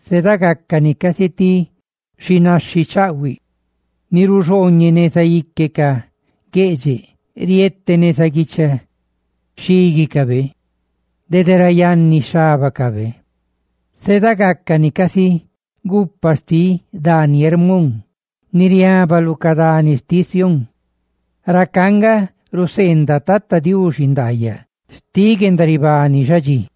Zeeda gácani casi ti xinaxhi chaꞌhuiꞌ ni ruxhooñeꞌ neza ique ca gueꞌdxeꞌ rietetí ni lu guicha xhíguicaꞌ dede ra yanni xhábacaꞌ. Zeeda gácani casi gupa xtiꞌ dani Hermón, ni riaba lu ca dani xtiꞌ Sión. Racá nga ruseendaꞌ Tata Diuxi ndaayaꞌ xtiꞌ guendaribani xadxí.